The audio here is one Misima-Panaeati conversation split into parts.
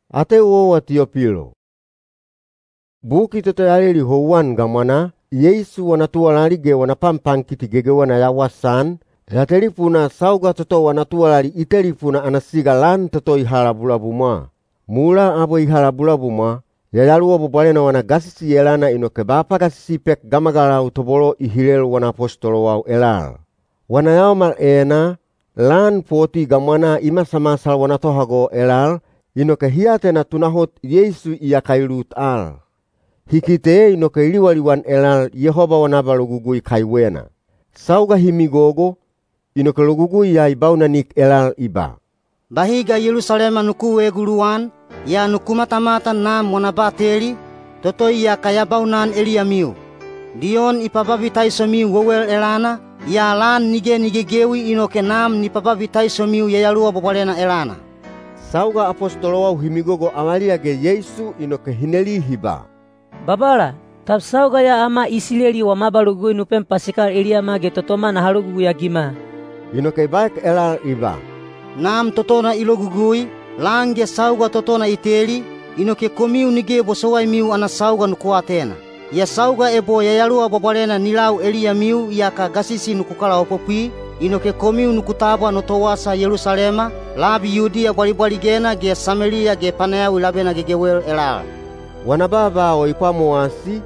Ateu owa Tiyopilo. Buki toto ya leli houwan gamwanaa, Yeisu wana tuwalali ge wana panpankiti gegewena ya wasaan, ya telipunaa sauga toto wana tuwalali i telipuna ana siga lan toto i ha labulabumwa. Mulaa abwe i ha labulabumwa, Yayaluwa Bwabwalena wana gasisi elana inoke ba pagasisi i pek gamagalau tobolo i hilel wana apostolowau elal. Wana yaomal enaa, lan poti gamwanaa i masamasal wana tohago elal, inoke hi atena tunahot Yeisu iyaka i lut al. Hi kite inoke i liwaliwan elal Yehoba wana abalogugui kaiwena. Sauga hi migogo, inoke logugui ya i baunanik elal i ba, “Bahi ga Yelusalema nuku eeguluwan, yaa nuku matamatan Nam wana bateli, toto iyaka ya baunan eliyamiu. Diyon i pababitaisomiu wewel elana, yaa lan nige ni gegewi inoke Nam ni pababitaisomiu Yayaluwa Bwabwalena elana.” Sauga apostolowau hi migogo avaliya ge Yeisu inoke hi neli hi ba, “Babala, tab sauga ya ama Isileli wama abalogugui nu pem pasikal eliyama ge totoma naha logugui-agima?” Inoke i baek elal i ba, “Nam totona i logugui, lan ge sauga totona i teli, inoke komiu nige bosowaimiu ana sauga nuku atena. Yaa sauga ebo Yayaluwa Bwabwalena ni lau eliyamiu yaka gasisi nuku kalaopopwi, inoke komiu nuku tabwa no towasa Yelusalema, labi Yudiya bwalibwaligena ge Sameliya ge panayawi labena gegewel elal.” Wana baaba o i pwamowasi,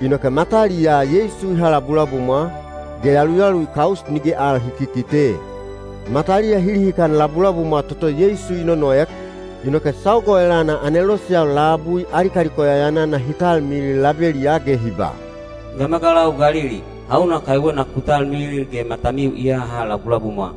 inoke mataliyaa Yeisu i ha labulabumwa, ge yaluyalu i kaus nige al hi kikite. Mataliya hi lihikan labulabumwa toto Yeisu i nonoek, inoke sauga o elana aneloseyau labui ali kaliko yayanana hi talmilil labeliyaa ge hi ba, “Gamagalau Galili, hauna kaiwena ku talmilil ge matamiu i haha labulabumwa?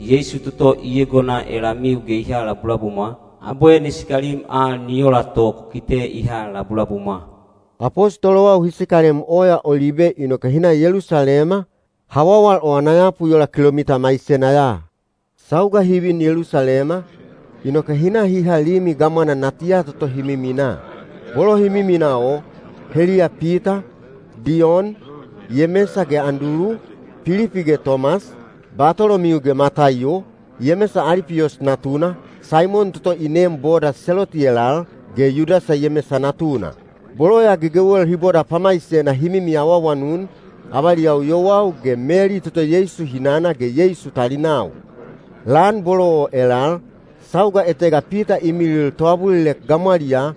Yeisu toto i egona elamiu ge i ha labulabumwa, abwe ni sikalim al ni ola to ku kite i ha labulabumwa.” Apostolowau hi sikalem Oya Olibe inoke hi na Yelusalema, hawawal o ana yapu i ola kilomita maisena ya. Sauga hi vin Yelusalema, inoke hi na hi ha limi gamwana natiya toto hi miminaa. Bolo hi miminaa o, heliya Pita, Diyon, Yemesa ge Andulu, Pilipi ge Tomas, Batolomiu ge Mataiyo, Yemesa Alipiyos natuna, Saimon toto i neem boda Seloti elal, ge Yudasa Yemesa natuna. Bolo ya gegewel hi boda pamaisena hi mimi awaawanun, avaliyau yowau ge Meli toto Yeisu hinana ge Yeisu talinau. Lan bolo o elal, sauga etega Pita i milil toabulilek gamwaliyaa,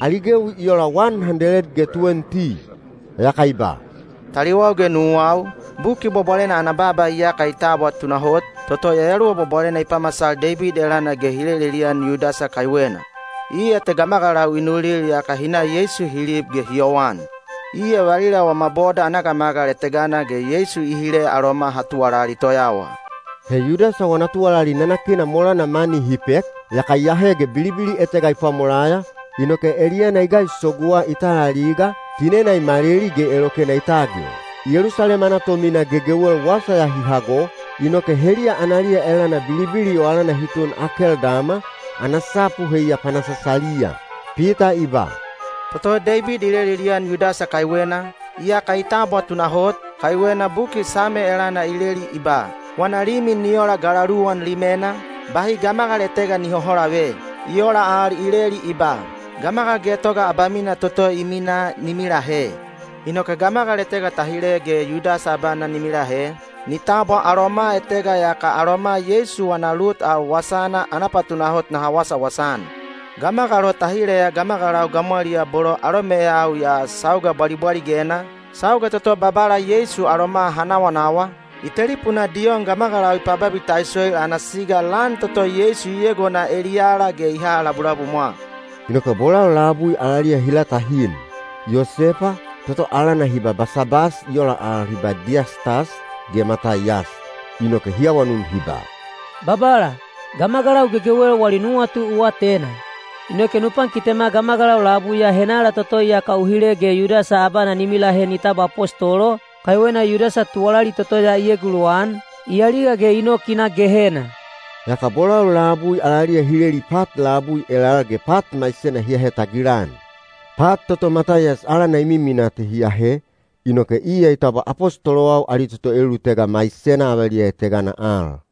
ali gewi i ola wan handeled ge tuwenti. Yaka i ba, “Taliwau ge nuwau, Buki Bwabwalena ana baaba iyaka i tabwa tunahot, toto Yayaluwa Bwabwalena i pamasal Deibid elana ge i lelelian Yudasa kaiwena. Iya te gamagalau i nulil yaka hi na Yeisu hi lib ge hi yowan. Iya valila wama boda ana gamagal etegana ge Yeisu i hile aloma ha tuwalali toyawa.” (He Yudasa wana tuwalali nanakina molana mani hi pek, yaka i ahe ge bilibili etega i pwamolaya, inoke eliyana i gaisoguwa i tal aliga, tinena i maleli ge elokena i tagil. Yelusalema ana tomina gegewel wasa ya hi hago, inoke heliya analiya elana bilibili o alana hi tun Akeldama, ana sapu heiya “Panasasaliya.”) Pita i ba, “Toto Deibid i lelelian Yudasa kaiwena, iyaka i tabwa tunahot, kaiwena buki Same elana i leli i ba, ‘Wana limi ni ola galaluwan limena, bahi gamagal etega ni hoholave.’ I ola al i leli i ba, ‘Gamagal getoga abamina toto i minaa ni milahe.’ Inoke gamagal etega ta hile ge Yudasa abana ni milahe, ni tabwa aloma etega yaka aloma Yeisu wana lut al wasana ana patunahot naha wasawasa-an. Gamagal o ta hileya gamagalau gamwaliyaa bolo alomeyau ya sauga bwalibwaligena, sauga toto Babala Yeisu aloma ha nawanawa, i telipunaa Diyon gamagalau i pababitaisoil ana siga lan toto Yeisu i egona eliyala ge i ha labulabumwa.” Inoke bolau labui alaliya hi latahin: Yosepa, toto alana hi ba Basabas (i ola al hi ba Diyastas), ge Mataiyas. Inoke hi awanun hi ba, “Babala, gamagalau gegewel wali nuwatu u atena. Inoke nu pankitema gamagalau labui ya henala toto iyaka u hile ge Yudasa abana ni milahe ni tabwa apostolo, kaiwena Yudasa tuwalali toto ya i eguluwan, i aliga ge i nok i na Gehena.” Yaka bolau labui alaliya hi leli pat labui elal ge pat maisena hi ahe tagilan. Pat toto Mataiyas alana i miminaa te hi ahe, inoke iya i tabwa apostolowau ali toto elulutega maisena avaliya etegana al.